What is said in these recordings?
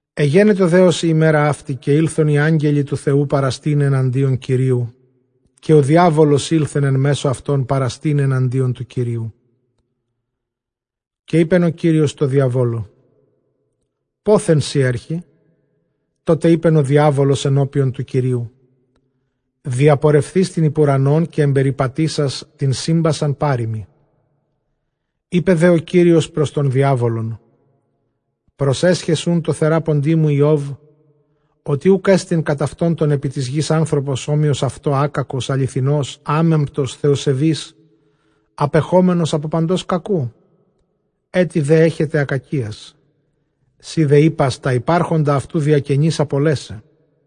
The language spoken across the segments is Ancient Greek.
Ἐγένετο δὲ ὡς ἡ ἡμέρα αὕτη, καὶ ἦλθον οἱ ἄγγελοι τοῦ Θεοῦ παραστῆναι ἔναντι Κυρίου, καὶ ὁ διάβολος ἦλθεν ἐν μέσῳ αὐτῶν παραστῆναι ἐναντίον τοῦ Κυρίου. Καὶ εἶπεν ὁ Κύριος τῷ διαβόλῳ, πόθεν σὺ ἔρχῃ; τότε εἶπεν ὁ διάβολος ἐνώπιον τοῦ Κυρίου, διαπορευθεὶς τὴν ὑπʼ οὐρανὸν, καὶ ἐμπεριπατήσας τὴν σύμπασαν, πάρειμι. Εἶπε δὲ ὁ Κύριος πρὸς τὸν διάβολον, προσέσχες οὖν τῷ θεράποντί μου Ἰὼβ, ὅτι οὐκ ἔστι κατʼ αὐτὸν τῶν ἐπὶ τῆς γῆς; ἄνθρωπος ἄκακος, ἀληθινὸς, ἄμεμπτος, θεοσεβὴς, ἀπεχόμενος ἀπὸ παντὸς κακοῦ, ἔτι δὲ ἔχεται ἀκακίας· σὺ δὲ εἶπας ὑπάρχοντα αὐτοῦ διακενῆς ἀπολέσαι.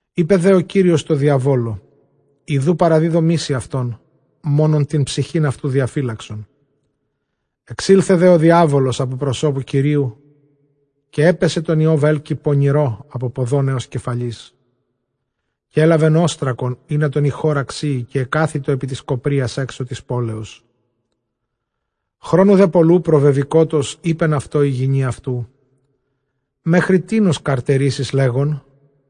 Εἶπε δὲ ὁ Κύριος τῷ διαβόλῳ, ἰδοὺ παραδίδωμί σοι αὐτόν· μόνον τὴν ψυχὴν αὐτοῦ διαφύλαξον. Ἐξῆλθε δὲ ὁ διάβολος ἀπὸ τοῦ Κυρίου· καὶ ἔπαισε τὸν Ἰὼβ ἕλκει πονηρῷ ἀπὸ ποδῶν ἕως κεφαλῆς. Καὶ ἔλαβεν ὄστρακον, ἵνα τὸν ἰχῶρα ξύῃ, καὶ ἐκάθητο ἐπὶ τῆς κοπρίας ἔξω τῆς πόλεως. Χρόνου δὲ πολλοῦ προβεβηκότος, εἶπεν αὐτῷ ἡ γυνὴ αὐτοῦ, μέχρι τίνος καρτερήσεις, λέγων,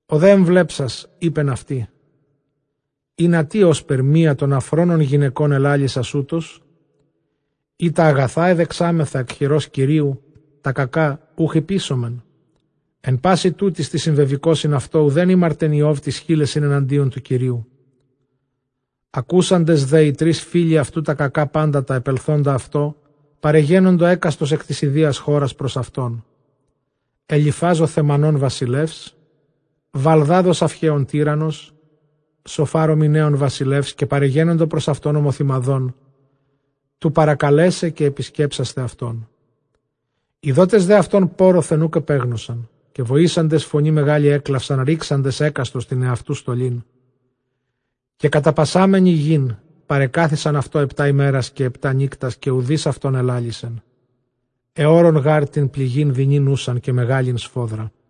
Ὁ δὲ ἐμβλέψας, εἶπεν αὐτῇ, ὥσπερ μία τῶν ἀφρόνων γυναικῶν ἐλάλησας· εἰ τὰ ἀγαθὰ ἐδεξάμεθα ἐκ χειρὸς Κυρίου, τὰ κακὰ οὐχ ὑποίσομεν; Ἐν πᾶσι τούτοις τοῖς συμβεβηκόσιν αὐτῷ οὐδὲν ἥμαρτεν Ἰὼβ τοῖς χείλεσιν ἐναντίον τοῦ Θεοῦ. Ἀκούσαντες δὲ οἱ τρεῖς φίλοι αὐτοῦ τὰ κακὰ πάντα τὰ ἐπελθόντα αὐτῷ, παρεγένοντο ἕκαστος ἐκ τῆς ἰδίας χώρας πρὸς αὐτόν· Ἐλιφὰζ ὁ Θαιμανῶν βασιλεὺς, Βαλδὰδ ὁ Σαυχέων τύραννος, Σωφὰρ Μιναίων βασιλεύς· καὶ παρεγένοντο πρὸς αὐτὸν ὁμοθυμαδὸν, τοῦ παρακαλέσαι καὶ ἐπισκέψασθαι αὐτόν. Ἰδόντες δὲ αὐτὸν πόῤῥωθεν, οὐκ ἐπέγνωσαν· καὶ βοήσαντες φωνῇ μεγάλῃ ἔκλαυσαν, ῥήξαντες ἕκαστος τὴν ἑαυτοῦ στολὴν, καὶ καταπασάμενοι γῆν. παρεκάθισαν αὐτῷ ἑπτὰ ἡμέρας καὶ ἑπτὰ νύκτας, καὶ οὐδεὶς αὐτῶν ἐλάλησεν· ἑώρων γὰρ τὴν πληγὴν δεινὴν οὖσαν καὶ μεγάλην σφόδρα.